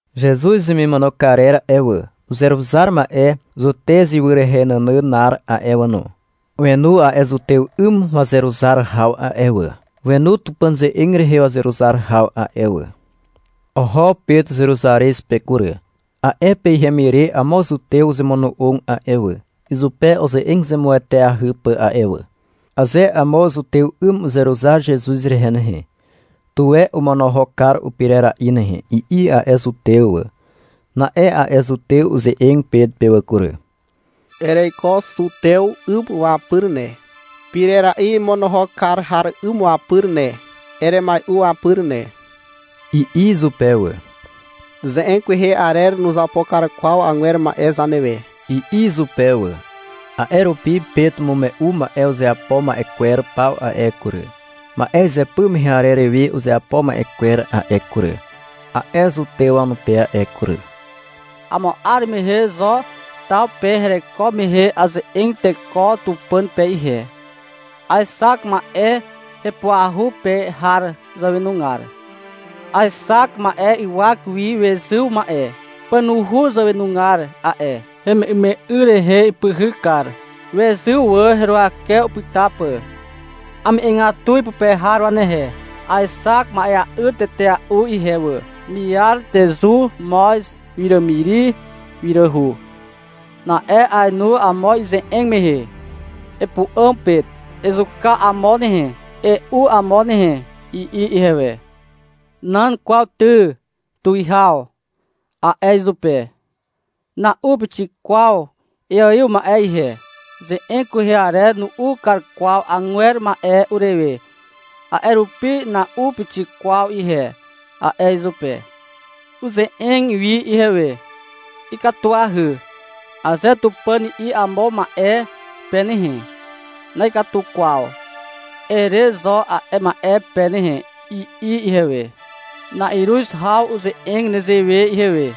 Zezuz hemimono karer a'e wà, uzeruzar ma'e Zutez ywy nànànar a'e wà no, wenu a'e zutew 'ym wazeruzar haw a'e wà, wenu Tupàn ze'eg rehe wazeruzar haw a'e wà. Oho Pet Zeruzarez pe kury. A'e pe ihem ire amo zutew uzemono'og a'e wà, izupe uze'eg zemueteahy pà a'e wà. (Aze amo zutew 'ym uzeruzar Zezuz rehe nehe, tuwe omonohok kar upirera'i nehe, i'i a'e zutew wà.) Na'e a'e zutew uze'eg Pet pe wà kury. — Ereiko zutew 'ym wapyr ne, pirera'i imonohok kar har 'ym wapyr ne. Eremai'u wapyr ne, i'i izupe wà. — Ze'eg kwehe arer nuzapo kar kwaw agwer ma'e zanewe, i'i izupe wà. A'e rupi Pet umume'u ma'e uzeapo ma'e kwer paw a'e kury, ma'e izypy mehe arer we uzeapo ma'e kwer a'e kury, a'e zutew wanupe a'e kury. — Amo 'ar mehe Zo taw pe hereko mehe aze'eg teko Tupàn pe ihe. Aexak ma'e hepuahu pe har zàwenugar. Aexak ma'e ywak wi wezyw ma'e. Pànuhu zàwenugar a'e, heme'yme'y rehe ipyhyk kar, wezyw wà heruwake upyta pà. Ame'egatu ipupe har wanehe. Aexak ma'ea'yr tetea'u ihe wà: miar, tezu, moz, wiràmiri, wiràhu. Na'e ainu amo ize'eg mehe. — Epu'àm, Pet, ezuka amo nehe, e'u amo nehe, i'i ihewe. — Nan kwaw ty, tuwihaw, a'e izupe. — Na'u pixik kwaw iaiw ma'e ihe. Ze'eg kwehe arer nu'u kar kwaw agwer ma'e urewe, a'e rupi na'u pixik kwaw ihe, a'e izupe. Uze'eg wi ihewe. -Ikatuahy, aze Tupàn i'i amo ma'e pe nehe, -Na'ikatu kwaw, ere zo a'e ma'e pe nehe, i'i ihewe. Na'iruz haw uze'eg nezewe ihewe.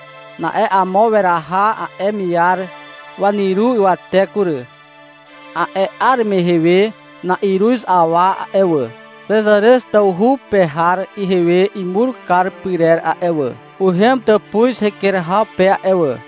Na'e amo weraha a'e miar wanyru ywate kury. A'e 'ar mehe we na'iruz awa a'e wà, Xezarez tawhu pe har ihewe imur kar pyrer a'e wà, uhem tàpuz heker haw pe a'e wà.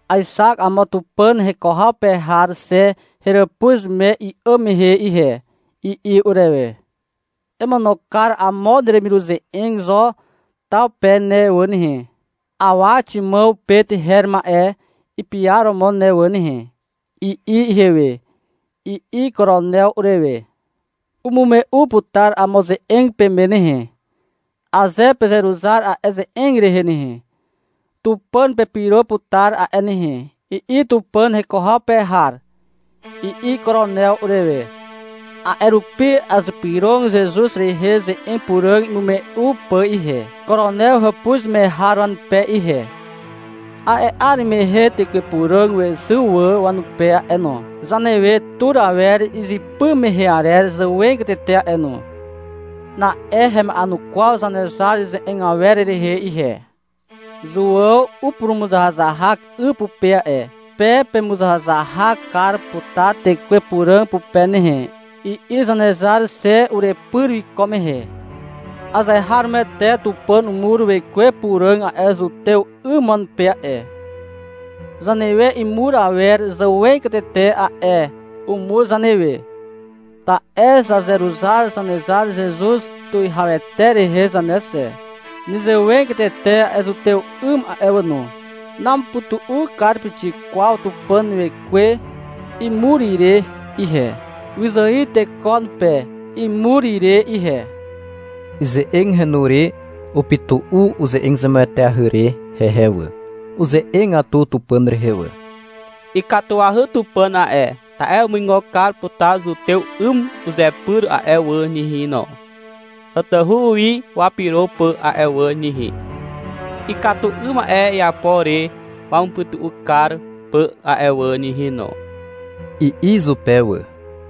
— Aexak amo Tupàn heko haw pe har xe heràpuz me i'àm mehe ihe, i'i urewe. — Emono kar amo neremiruze'eg Zo taw pe ne wà nehe, awa Ximàw Pet her ma'e ipiaromo ne wà nehe, i'i ihewe, i'i Koronew urewe. — Umume'u putar amo ze'eg peme nehe. Aze pezeruzar a'e ze'eg rehe nehe, Tupàn pepyro putar a'e nehe, i'i Tupàn heko haw pe har, i'i Koronew urewe. A'e rupi azypyrog Zezuz rehe ze'eg puràg imume'u pà ihe, Koronew hàpuz me har wanupe ihe. A'e 'ar mehe Tekwe Puràg wezyw wà wanupe a'e no, zanewe tur awer izypy mehe arer zàwegatete a'e no. Na'e hema'enukwaw Zanezar ze'eg awer rehe ihe. — Zuàw upurumuzahazahak 'y pupe a'e. Pe pezemuzahazahak kar putar Tekwe Puràg pupe nehe, i'i Zanezar xe urepyr wiko mehe. Azeharomoete Tupàn umur Wekwe Puràg a'e zutew 'ym wanupe a'e, zanewe imur awer zàwegatete a'e. Umur zanewe, ta'e zazeruzar Zanezar Zezuz Tuwihawete rehe zane xe. Nezewegatete a'e zutew 'ym a'e wà no. Namupytu'u kar pixik kwaw Tupàn Wekwe imur ire ihe, wyzài teko wanupe imur ire ihe. Ize'eg henu re upytu'u uze'eg zemueteahy re hehe wà. Uze'egatu Tupàn rehe wà. — Ikatuahy Tupàn a'e, ta'e umuigo kar putar zutew 'ym uzepyr a'e wà nehe no, tatahu wi wapyro pà a'e wà nehe, ikatu 'ym ma'e iapo re wamupytu'u kar pà a'e wà nehe no, i'i izupe wà.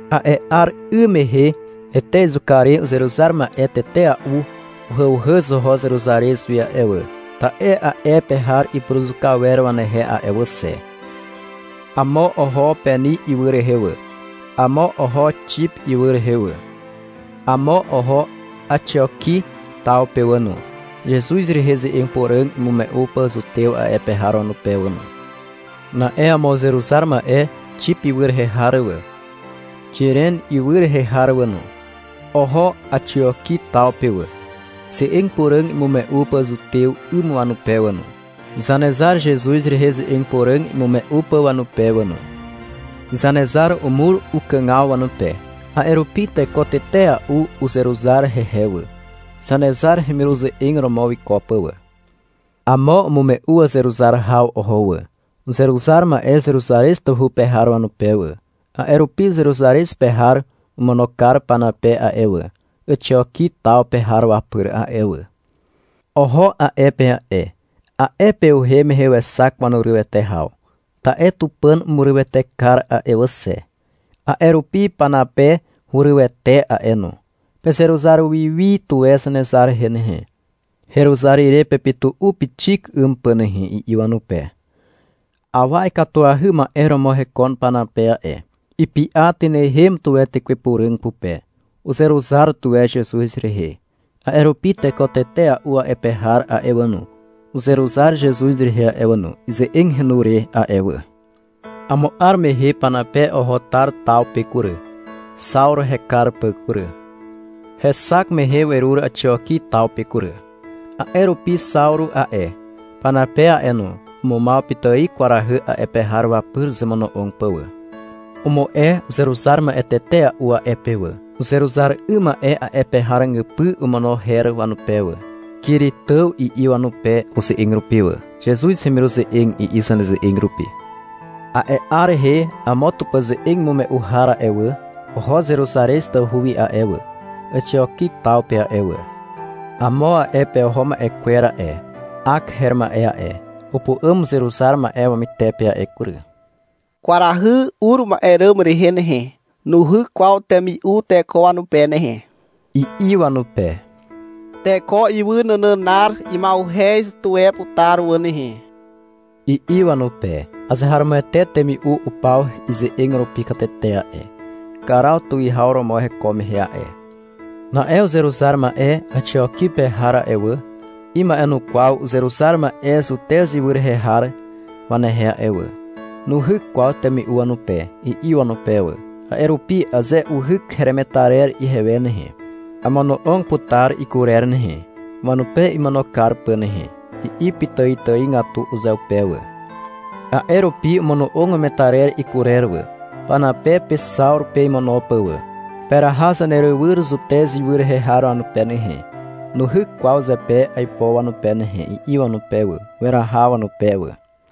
A'e 'ar 'ym mehe Ete izuka re uzeruzar ma'e tetea'u uhàuhàz oho Zeruzarez wi a'e wà, ta'e a'e pe har ipuruzuka wer wanehe a'e wà xe. Amo oho Peni ywy rehe wà. Amo oho Xip ywy rehe wà, amo oho Àxioki taw pe wà no, Zezuz rehe ze'eg puràg imume'u pà zutew a'e pe har wanupe wà no. Na'e amo uzeruzar ma'e Xip ywy rehe har wà, Xiren ywy rehe har wà no, oho Àxioki taw pe wà, ze'eg puràg imume'u pà zutew 'ym wanupe wà no, Zanezar Zezuz rehe ze'eg puràg imume'u pà wanupe wà no. Zanezar umur ukàgaw wanupe. A'e rupi teko tetea'u uzeruzar hehe wà, Zanezar hemiruze'eg romo wiko pà wà. Amo umume'u wazeruzar haw oho wà, uzeruzar ma'e Zeruzarez tawhu pe har wanupe wà. A'e rupi Zeruzarez pe har omono kar Panape a'e wà, Àxioki taw pe har wapyr a'e wà. Oho a'e pe a'e. A'e pe uhem mehe wexak wanurywete haw. Ta'e Tupàn umurywete kar a'e wà xe. A'e rupi Panape hurywete a'e no. -Pezeruzar wi wi tuwe Zanezar rehe nehe, heruzar ire pepytu'u pixik 'ym pà nehe, i'i wanupe. Awa ikatuahy ma'e romo hekon Panape a'e. Ipy'a tynehem tuwe Tekwe Puràg pupe. Uzeruzar tuwe Zezuz rehe. A'e rupi teko tetea'u a'e pe har a'e wà no, uzeruzar Zezuz rehe a'e wà no, ize'eg henu re a'e wà. Amo 'ar mehe Panape oho Tar taw pe kury, Xawru hekar pà kury. Hexak mehe werur Àxioki taw pe kury. A'e rupi Xawru a'e, Panape a'e no, umumaw pitài kwarahy a'e pe har wapyr uzemono'og pà wà. Umu'e uzeruzar ma'e tetea'u a'e pe wà. Uzeruzar 'ym ma'e a'e pe har ràgypy omono her wanupe wà. — Kiritàw, i'i wanupe uze'eg rupi wà. — Zezuz hemiruze'eg, i'i zaneze'eg rupi. A'e 'ar rehe amo Tupàn ze'eg imume'u har a'e wà, oho Zeruzarez tawhu wi a'e wà, Àxioki taw pe a'e wà. Amo a'e pe oho ma'e kwer a'e, Ak her ma'e a'e, upu'àm uzeruzar ma'e wamytepe a'e kury. -Kwarahy ur ma'e ràm rehe nehe, nuhyk kwaw temi'u teko wanupe nehe, i'i wanupe. -Teko ywy nànànar ima'uhez tuwe putar wà nehe, i'i wanupe. (Azeharomoete temi'u upaw ize'eg rupi katete a'e, Karaw tuwihaw romo heko mehe a'e.) Na'e uzeruzar ma'e Àxioki pe har a'e wà, ima'enukwaw uzeruzar ma'e Zutez ywy rehe har wanehe a'e wà. — Nuhyk kwaw temi'u wanupe, i'i wanupe wà. — A'e rupi aze uhyk heremetarer ihewe nehe, amono'og putar ikurer nehe, wanupe imono kar pà nehe, i'i pitàitàigatu uzeupe wà. A'e rupi omono'og wemetarer ikurer wà, Panape pe Xawru pe imono pà wà. — Peraha zanerywyr Zutez ywy rehe har wanupe nehe, nuhyk kwaw zepe aipo wanupe nehe, i'i wanupe wà. Weraha wanupe wà.